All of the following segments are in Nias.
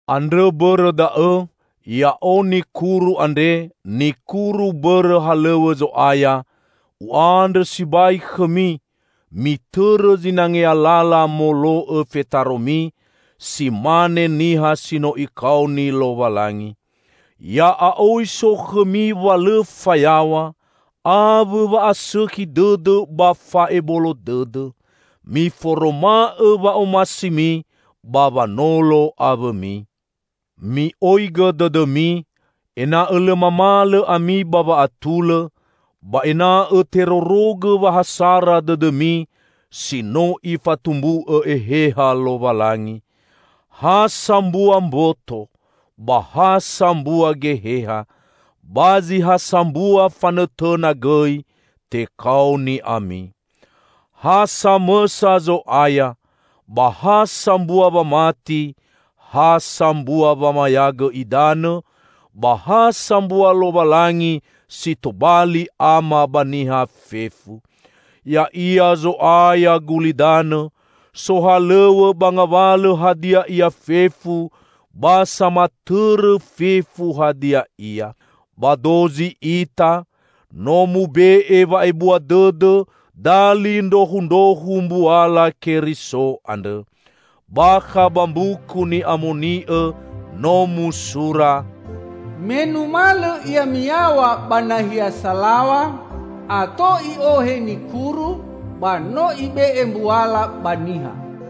Andrõ bõrõ da'õ -- ya'o nikuru andre, nikuru bõrõ halõw̃õ Zo'aya -- u'andrõ sibai khõmi: mitõrõ zinangea lala molo'õ fetaromi, si mane niha si no Ikaoni Lowalangi. Ya'a'oi so khõmi wa lõ fayaw̃a, awõ wa'asõkhi dõdõ ba fa'ebolo dõdõ. Miforoma'õ wa'omasimi ba wanolo awõmi. Mi'oigõ dõdõmi, ena'õ lõ mamalõ ami ba wa'atulõ, ba ena'õ terorogõ wa ha sara dõdõmi si no Ifatumbu'õ Eheha Lowalangi. Ha sambua mboto, ba ha sambua Geheha. Ba zi ha sambua fanõtõna gõi tekaoni ami. Ha samõsa Zo'aya, ba ha sambua wamati, ha sambua wamayagõ idanõ, ba ha sambua Lowalangi si tobali Ama ba niha fefu. Ya'ia Zo'aya gulidanõ, sohalõw̃õ ba ngawalõ hadia ia fefu, ba samatõrõ fefu hadia ia. Ba dozi ita, no mube'e wa'ebua dõdõ dali ndrohundrohu mbuala Keriso andrõ. Bakha ba Mbuku Ni'amoni'õ no musura, "Me numalõ Ia miyaw̃a ba nahia salaw̃a, ato I'ohe nikuru; ba no Ibe'e mbuala ba niha."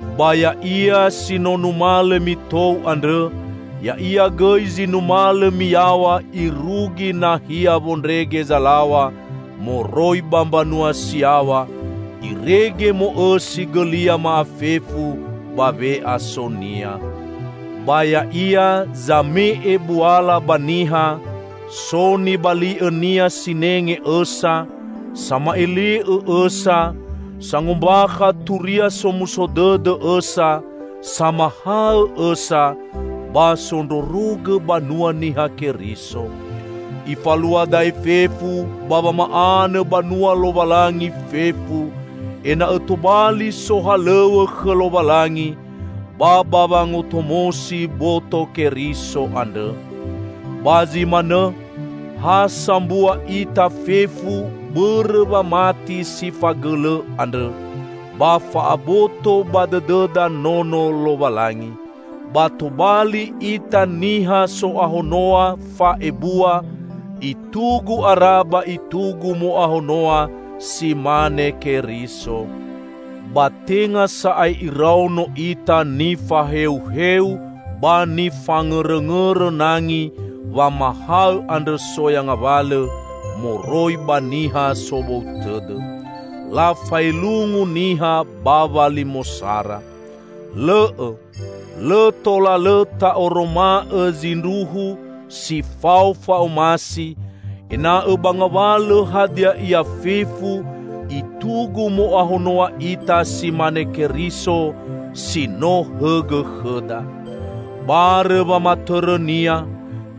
Ba Ya'ia si no numalõ mitou andrõ, Ya'ia gõi zi numalõ miyaw̃a irugi nahia wondrege zalaw̃a moroi ba mbanua si yaw̃a, irege mo'õsi gõlia ma'afefu ba we'aso-Nia. Ba Ya'ia "zame'e buala ba niha"; so nibali'õ-Nia sinenge õsa, sama'ele'õ õsa; sangombakha Turia Somuso Dõdõ õsa, samahaõ õsa, ba sondrorogõ banua Niha Keriso. Ifalua da'e fefu ba wama'anõ banua Lowalangi fefu, ena'õ tobali sohalõw̃õ khõ Lowalangi, ba ba wangotomosi boto Keriso andrõ. Ba zi manõ, ha sambua ita fefu bõrõ wamati si fagõlõ andrõ, ba fa'aboto ba dõdõda Nono Lowalangi. Ba tobali ita niha so'ahonoa fa'ebua, i'tugu ara ba itugu mo'ahonoa si mane Keriso. Ba tenga sa'ae iraono ita nifaheuheu ba nifangõrõngõrõ nangi wamahaõ andrõ soya ngawalõ moroi ba niha sobou tõdõ. Lafaelungu niha ba walimosara. Lõ'õ! Lõ tola lõ ta'oroma'õ zindruhu si fao fa'omasi, ena'õ ba ngawalõ hadia ia fefu itugu mo'ahonoa ita si mane Keriso, si no hõgõ khõda. Barõ wamatõrõ-Nia,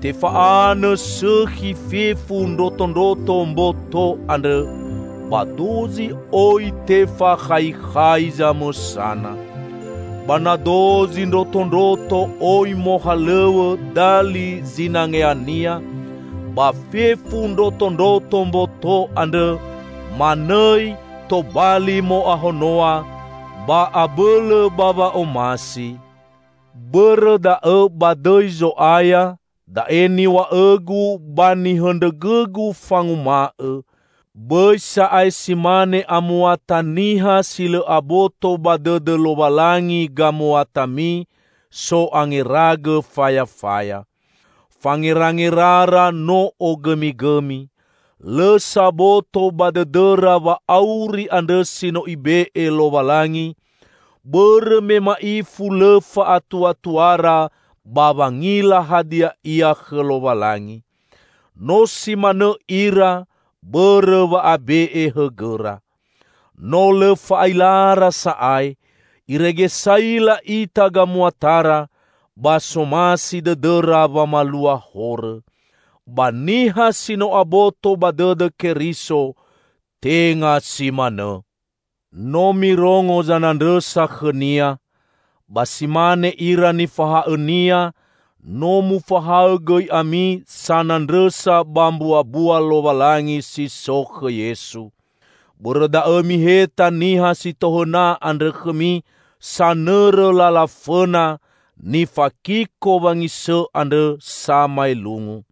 tefa'anõ sõkhi fefu ndrotondroto mboto andrõ, ba dozi oi tefakhaikhai zamõsana. Ba na dozi ndrotondroto oi mohalõw̃õ dali zinangeania, ba fefu ndrotondroto mboto andrõ manõi tobali mo'ahonoa, ba abõlõ ba wa'omasi. Bõrõ da'õ ba dõi Zo'aya, da'e niw̃a'õgu ba nihõndrõgõgu fanguma'õ: bõi sa'ae si mane amuata niha si lõ aboto ba dõdõ Lowalangi gamuatami, so'angeragõ fayafaya. Fangerangerara no ogõmigõmi. Lõ saboto ba dõdõra wa'auri andrõ si no Ibe'e Lowalangi, bõrõ me ma'ifu lõ fa'atuatuara ba wangila hadia ia khõ Lowalangi. No si manõ ira bõrõ wa'abe'e hõgõra. No lõ fa'ailara sa'ae, irege saila ita gamuatara, ba somasi dõdõra wamalua horõ. Ba niha si no aboto ba dõdõ Keriso, tenga si manõ! No mirongo zanandrõsa khõ-Nia! Ba si mane ira nifahaõ-Nia, no mufahaõ gõi ami sanandrõsa ba mbuabua Lowalangi si so khõ Yesu! Bõrõ da'õ miheta niha si tohõna andrõ khõmi, sanõrõ lala fõna, nifakiko wangisõ andrõ samaelungu.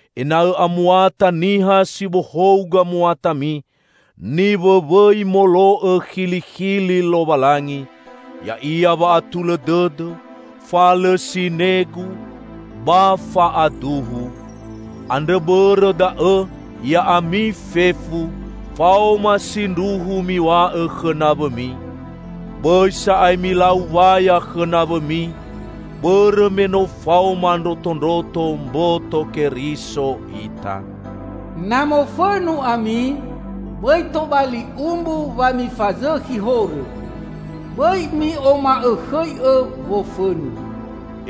Ena'õ amuata niha si bohou gamuatami, niwõwõi molo'õ khilikhili Lowalangi; ya'ia wa'atulõ dõdõ, fa lõ sinegu, ba fa'aduhu. Andrõ bõrõ da'õ, ya'ami fefu, faoma sindruhu miw̃a'õ khõ nawõmi. Bõi sa'ae milau waya khõ nawõmi, bõrõ me no faoma ndrotondroto mboto Keriso ita. Na mofõnu ami, bõi tobali umbu wa mifazõkhi horõ. Bõi mi'oma'õkhõi'õ wofõnu,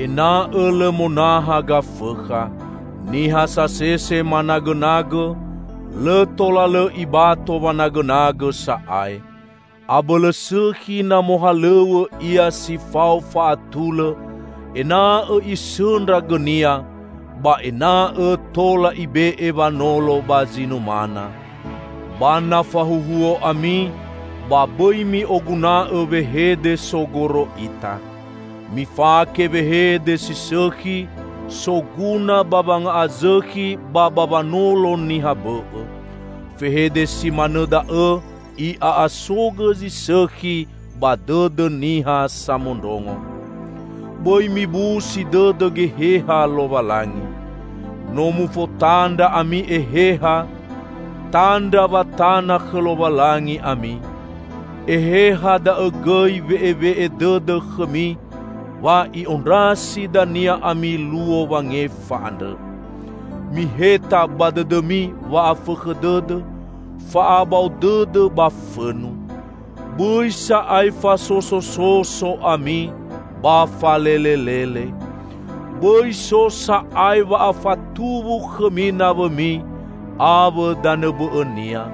ena'õ lõ monaha Gafõkha. Niha sasese managõnagõ, lõ tola lõ ibato wanagõnagõ sa'ae. Abõlõ sõkhi na mohalõw̃õ ia si fao fa'atulõ, ena'õ isõndra gõnia, ba ena'õ tola ibe'e wanolo ba zi numana. Ba na fahuohuo ami, ba bõi mi'oguna'õ wehede sogoro ita. Mifake wehede si sõkhi, soguna ba wanga'azõkhi ba ba wanolo niha bõ'õ. Fehede si manõ da'õ i'a'asogõ zi sõkhi ba dõdõ niha samondrongo. Bõi mibusi dõdõ Geheha Lowalangi. No mufotandra ami Eheha, tandra wa tana khõ Lowalangi ami. Eheha da'õ gõi we'ewe'e dõdõ khõmi wa i'ondrasi dania ami Luo Wangefa andrõ. Miheta ba dõdõmi wa'afõkhõ dõdõ, fa'abao dõdõ ba fõnu. Bõi sa'ae fasosososo ami ba falelelele. Bõi so sa'ae wa'afatuwu khõmi nawõmi, awõ danõ bõ'õnia.